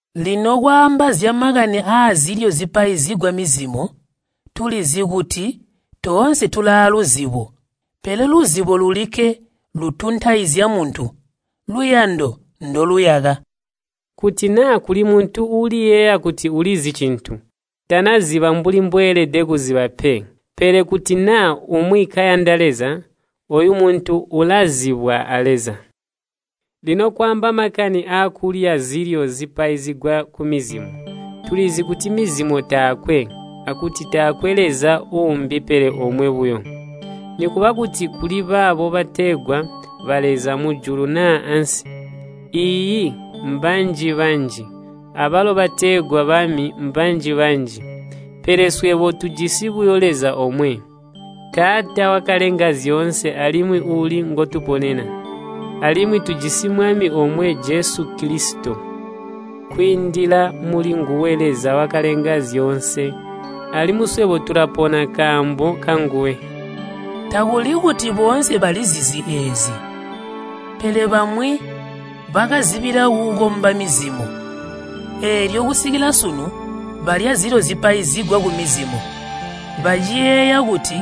Lino kwaamba zyamakani aazilyo zipaizigwa mizimo, tulizi kuti, “Toonse tulaaluzibo.” Pele luzibo lulikke lutuntaizya muntu. Luyando ndoluyaka. Kuti naa kuli muntu uuliyeeya kuti ulizi cintu, tanaziba mbuli mbweelede kuziba pe. Pele kuti naa umwi kayanda Leza, ooyo muntu ulazibwa a Leza. Lino kwaamba makani aakulya zilyo zipaizigwa kumizimo, tulizi kuti mizimo taakwe, akuti taakwe Leza uumbi pele omwe buyo. Nikuba kuti kuli baabo bategwa baleza mujulu naa ansi, iiyi, mbanji-banji, abalo bategwa bami mbanji-banji. Pele swebo tujisi buyo Leza omwe, Taata wakalenga zyoonse alimwi uuli ngotuponena. Alimwi tujisi Mwami omwe Jesu Kilisito. Kwiindila mulinguwe Leza wakalenga zyoonse, alimwi swebo tulapona nkaambo kanguwe. Takuli kuti boonse balizizi eezi pe. Pele bamwi bakazibila kukomba mizimo, eelyo kusikila sunu balya zilyo zipaizigwa kumizimo baciyeeya kuti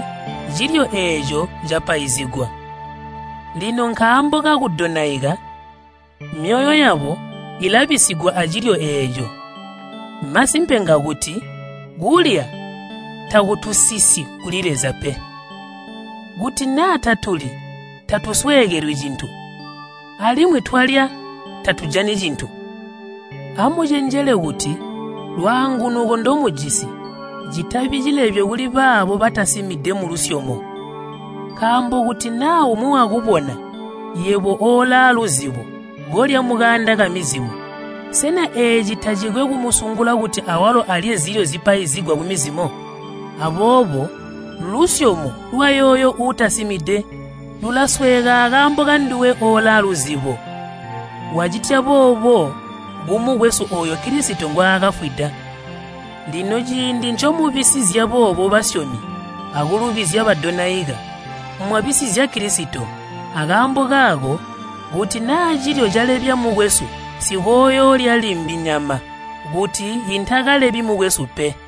cilyo eeco capaizigwa. Lino nkaambo kakudonaika, myoyo yabo ilabisigwa acilyo eeco. Masimpe ngakuti kulya takutusisyi kuli Leza pe. Kuti naa tatulyi tatusweekelwi cintu, alimwi twalya tatujani cintu. Amucenjele kuti lwaangunuko ndomujisi citabi cilebyo kuli baabo batasimide mulusyomo. Nkaambo kuti naa umwi wakubona, yebo oolaaluzibo kolya mukaanda kamizimo, sena eeci tacikwe kumusungula kuti awalo alye zilyo zipaizigwa kumizimo? Aboobo lusyomo lwayooyo uutasimide lulasweeka akaambo kanduwe oolaaluzibo. Wacitya boobo kumukwesu ooyo Kilisito ngwaakafwida. Lino ciindi ncomubisizya boobo basyomi akulubizya badonaika, mwabisizya Kilisito. Akaambo kaako kuti naa cilyo calebya mukwesu, nsikooyoolya limbi nyama, kuti intakalebyi mukwesu pe.